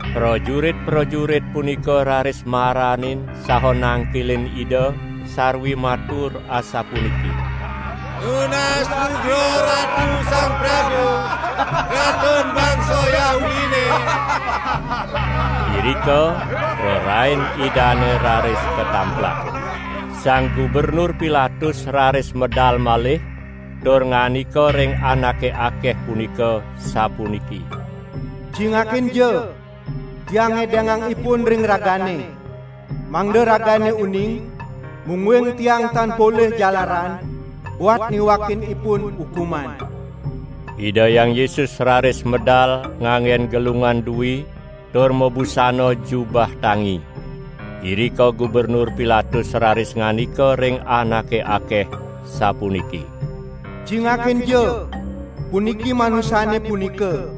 Prajurit-prajurit punika raris maranin saha nangkilin Ida sarwi matur asapuniki: "Nunas lugra Ratu Sang Prabu, Ratun bangsa Yahudine!" Irika prarain Idane raris katamplak. Sang Gubernur Pilatus raris medal malih tur ngandika ring anake akeh punika sapuniki: "Cingakinja, tiang ngedengang Ipun ring ragane, mangda ragane uning mungguing tiang tan polih jalaran buat niwakin Ipun ukuman." Ida Hyang Yesus raris medal nganggen gelungan dui tur mabusana jubah tangi. Irika Gubernur Pilatus raris ngandika ring anake akeh sapuniki: "Cingakinja! Puniki Manusane punika!"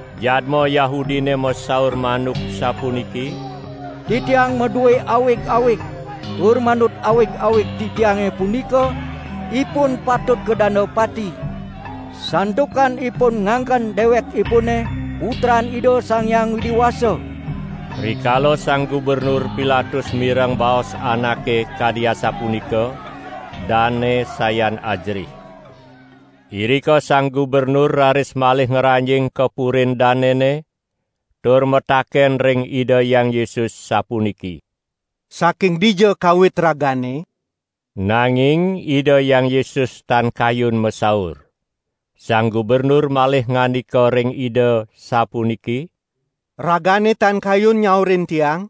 Jadma Yahudine masaur manuk sapuniki: "Titiang madue awig-awig tur manut awig-awig titiange punika Ipun patut kadanda pati, santukan Ipun ngangken dewekipune Putran Ida Sang Hyang Widi Wasa." Rikala Sang Gubernur Pilatus mireng baos anake kadi asapunika, dane sayan ajerih. Irika Sang Gubernur raris malih ngranjing ka purin danene tur mataken ring Ida Hyang Yesus sapuniki: "Saking dija kawit Ragane?" Nanging Ida Hyang Yesus tan kayun masaur. Sang Gubernur malih ngandika ring Ida sapuniki: "Ragane tan kayun nyaurin tiang?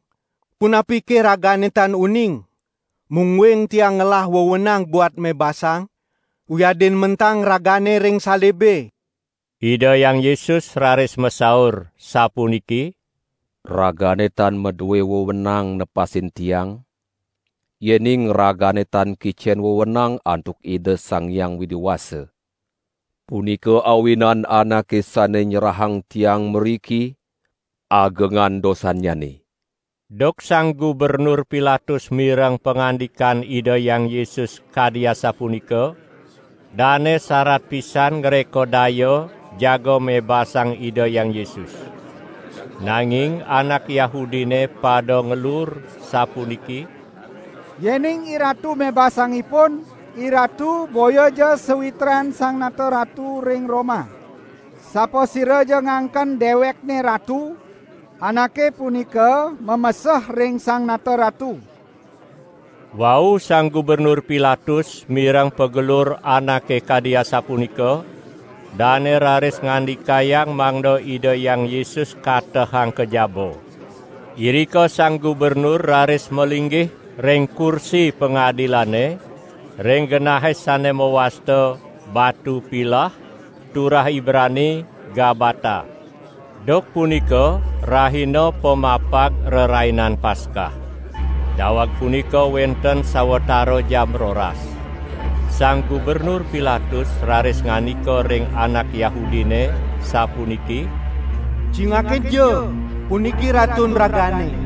Punapike Ragane tan uning mungguing tiang ngelah wewenang buat mebasang wiadin mentang Ragane ring salibe?" Ida Hyang Yesus raris masaur sapuniki: "Ragane tan madue wewenang nepasin Tiang, yening ragane tan kicen wewenang antuk Ida Sang Hyang Widi Wasa. Punika awinan anake sane nyerahang Tiang mriki, agengan dosannyane." Duk Sang Gubernur Pilatus mireng pangandikan Ida Hyang Yesus kadi asapunika, dane sarat pisan ngreka daya jaga mebasang Ida Hyang Yesus. Nanging anak Yahudine pada ngelur sapuniki: "Yening iratu mebasang Ipun, iratu boyaja sawitran Sang Nata Ratu ring Roma! Sapasiraja ngangken dewekne ratu, anake punika mameseh ring Sang Nata Ratu." Wau Sang Gubernur Pilatus mireng pagelur anake kadi asapunika, dane raris ngandikayang mangda Ida Hyang Yesus katehang ka jaba. Irika Sang Gubernur raris malinggih ring kursi pangadilane, ring genahe sane mawasta "Batu Pilah", turah Ibrani: "Gabbata". Duk punika rahina pamapag Rerainan Paskah. Daweg punika wenten sawatara jam roras. Sang Gubernur Pilatus raris ngandika ring anak Yahudine sapuniki: "Cingakinja, puniki Ratun ragane!"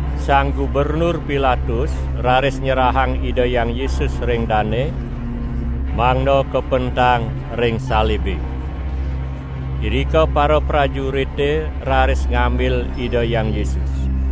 Sang Gubernur Pilatus raris nyerahang Ida Hyang Yesus ring dane, mangda kapentang ring salibe. Irika paraprajurite raris ngambil Ida Hyang Yesus.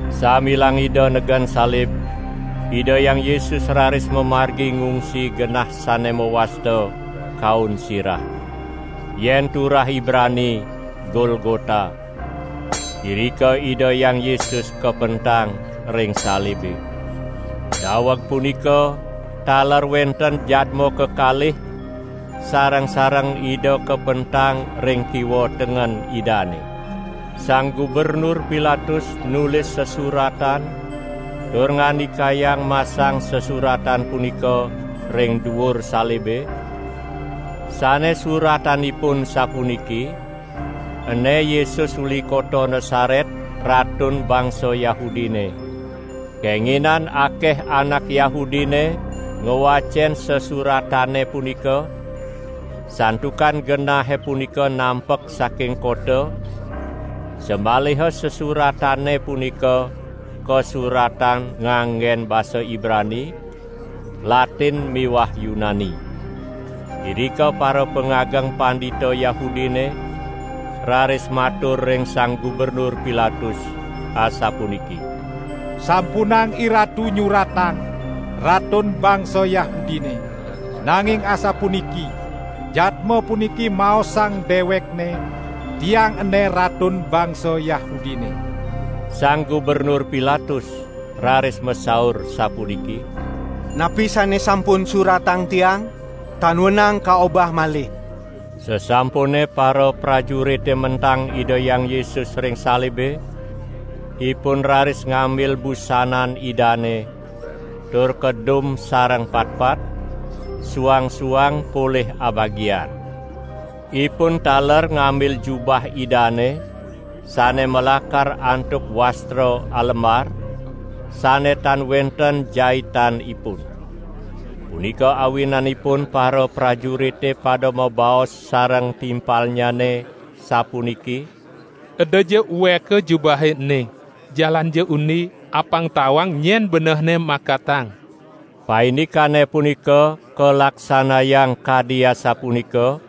Sambilang Ida negen salib, Ida Hyang Yesus raris mamargi ngungsi genah sane mawasta "Kaun Sirah", yen turah Ibrani: "Golgota". Irika Ida Hyang Yesus kapentang ring salibe. Daweg punika taler wenten jadma kekalih sareng-sareng Ida kapentang ring kiwa tengen Idane. Sang Gubernur Pilatus nulis sesuratan tur ngandikayang masang sesuratan punika ring duur salibe, sane suratanipun sapuniki: "Ene Yesus uli kota Nasaret Ratun bangsa Yahudine". Kenginan akeh anak Yahudine ngwacen sesuratane punika, santukan genahe punika nampek saking kota, samaliha sesuratane punika kasuratang nganggen basa Ibrani, Latin miwah Yunani. Irika parapangageng pandita Yahudine raris matur ring Sang Gubernur Pilatus asapuniki: "Sampunang iratu nyuratang 'Ratun bangsa Yahudine', nanging asapuniki: 'Jadma puniki maosang dewekNe: Tiang ene Ratun bangsa Yahudine'." Sang Gubernur Pilatus raris masaur sapuniki: "Napi sane sampun suratang tiang, tan wenang kaobah malih!" Sasampune paraprajurite mentang Ida Hyang Yesus ring salibe, ipun raris ngambil busanan Idane tur kadum sareng patpat, suang-suang polih abagian. Ipun taler ngambil jubah Idane, sane malakar antuk wastra alembar, sane tan wenten jaitanipun. Punika awinanipun paraprajurite pada mabaos sareng timpalnyane sapuniki: "Edaja ueka jubahe ene; jalanja undi, apang tawang nyen benehne makatang!" Paindikane punika kalaksanayang kadi asapunika,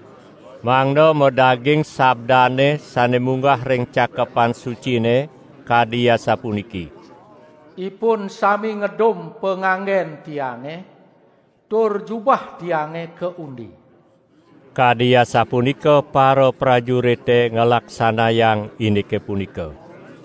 mangda madaging sabdane sane munggah ring Cakepan Sucine kadi asapuniki: "Ipun sami ngedum panganggen Tiange, tur jubah Tiange kaundi!" Kadi asapunika paraprajurite nglaksanayang indike punika.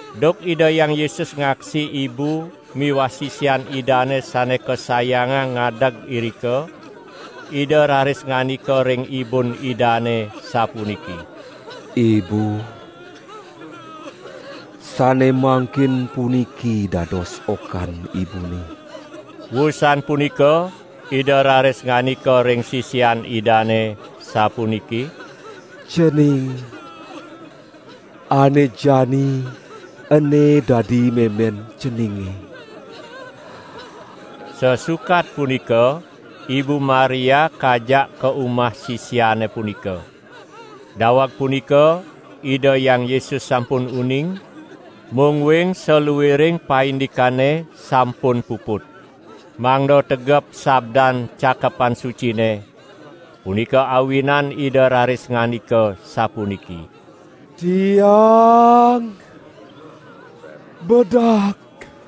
Duk Ida Hyang Yesus ngaksi ibu miwah sisian Idane sane kasayangang ngadeg irika, Ida raris ngandika ring ibun Idane sapuniki: "Ibu, sane mangkin puniki dados okan ibune." Wusan punika Ida raris ngandika ring sisian Idane sapuniki: "Cening, ane jani ene dadi memen ceninge!" Sasukat punika Ibu Maria kajak ka umah sisiane punika. Daweg punika Ida Hyang Yesus sampun uning, mungguing saluiring paindikane sampun puput. Mangda tegep sabdan Cakepan Sucine, punika awinan Ida raris ngandika sapuniki: "Tiang bedak!"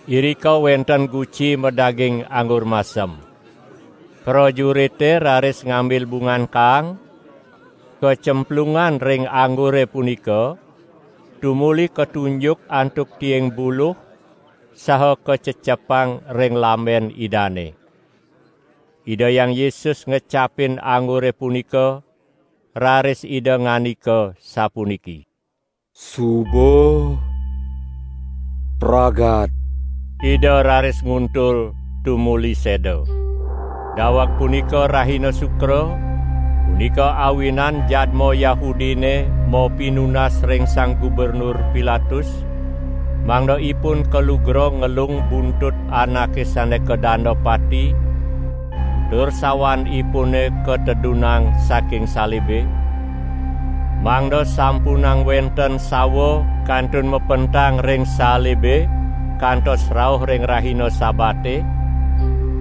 Irika wenten guci madaging anggur masem. Prajurite raris ngambil bungan kaang, kaclempungang ring anggure punika, tumuli katunjuk antuk tiing buluh saha kacecepang ring lamben Idane. Ida Hyang Yesus ngecapin anggure punika raris Ida ngandika sapuniki: "Suba pragat!" Ida raris nguntul, tumuli seda. Daweg punika rahina Sukra, punika awinan jadma Yahudine mapinunas ring Sang Gubernur Pilatus, mangda ipun kalugra ngelung buntut anake sane kadanda pati tur sawanipune katedunang saking salibe, mangda sampunang wenten sawa kantun mapentang ring salibe kantos rauh ring rahina Sabate,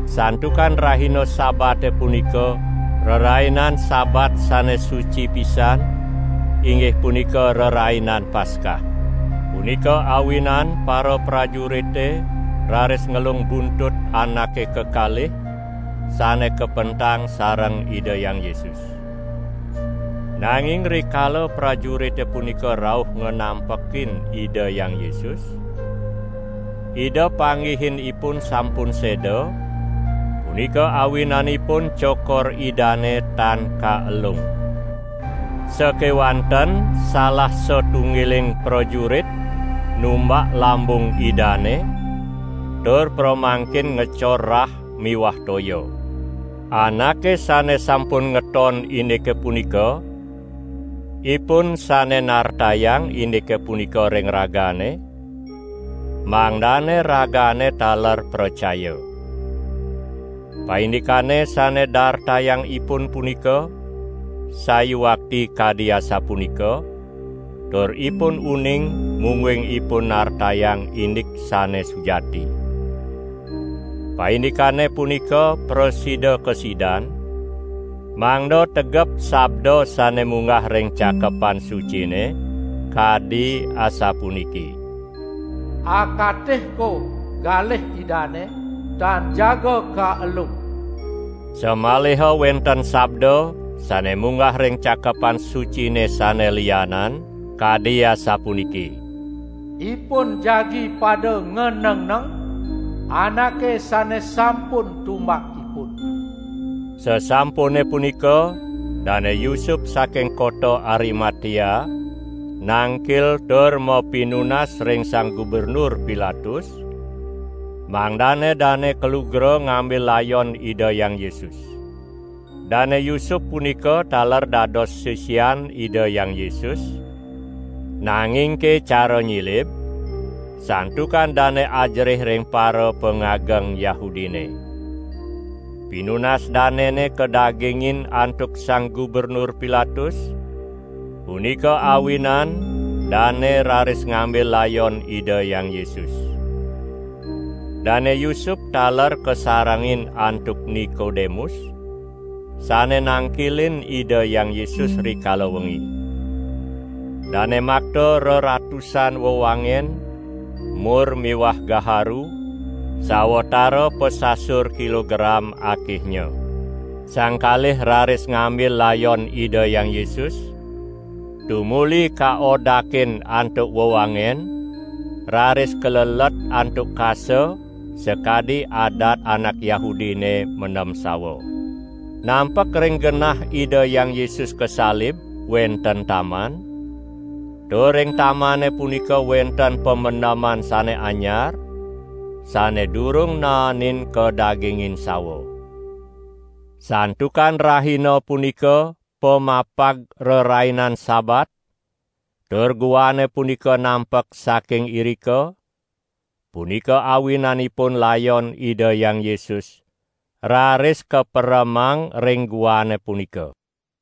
santukan rahina Sabate punika Rerainan Sabat sane suci pisan, inggih punika Rerainan Paskah. Punika awinan paraprajurite raris ngelung buntut anake kekalih sane kapentang sareng Ida Hyang Yesus. Nanging rikala prajurite punika rauh nganampekin Ida Hyang Yesus, Ida panggihin ipun sampun seda, punika awinanipun cokor Idane tan kaelung. Sakewanten salah satunggiling prajurit numbak lambung Idane tur pramangkin ngecor rah miwah toya. ( Anake sane sampun ngeton indike punika, ipun sane nartayang indike punika ring ragane, mangdane ragane taler pracaya. Paindikane sane dartayang ipun punika sayuakti kadi asapunika tur ipun uning mungguing ipun nartayang indik sane sujati.) Paindikane punika prasida kasidan, mangda tegep sabda sane munggah ring Cakepan Sucine kadi asapuniki: "Akatihko galih Idane tan jaga kaelung." Samaliha wenten sabda sane munggah ring Cakepan Sucine sane lianan kadi asapuniki: "Ipun jagi pada nganengneng Anake sane sampun tumbak ipun." Sasampune punika Dane Yusup saking kota Arimatea nangkil tur mapinunas ring Sang Gubernur Pilatus, mangdane dane kalugra ngambil layon Ida Hyang Yesus. Dane Yusup punika taler dados sisian Ida Hyang Yesus nangingke cara nyilib, santukan dane ajerih ring parapangageng Yahudine. Pinunas danene kadagingin antuk Sang Gubernur Pilatus, punika awinan dane raris ngambil layon Ida Hyang Yesus. Dane Yusup taler kasarengin antuk Nikodemus, sane nangkilin Ida Hyang Yesus rikala wengi. Dane makta reratusan wewangen mur miwah gaharu sawatara pasasur kilogram akehnya. Sang kalih raris ngambil layon Ida Hyang Yesus tumuli kaodakin antuk wewangen raris kalelet antuk kasa sakadi adat anak Yahudine mendem sawa. Nampek ring genah Ida Hyang Yesus kasalib wenten taman, tur ring tamane punika wenten pamendeman sane anyar, sane durung naenin kadagingin sawa. Santukan rahina punika pamapag Rerainan Sabat tur guane punika nampek saking irika, punika awinanipun layon Ida Hyang Yesus raris kaperemang ring guane punika.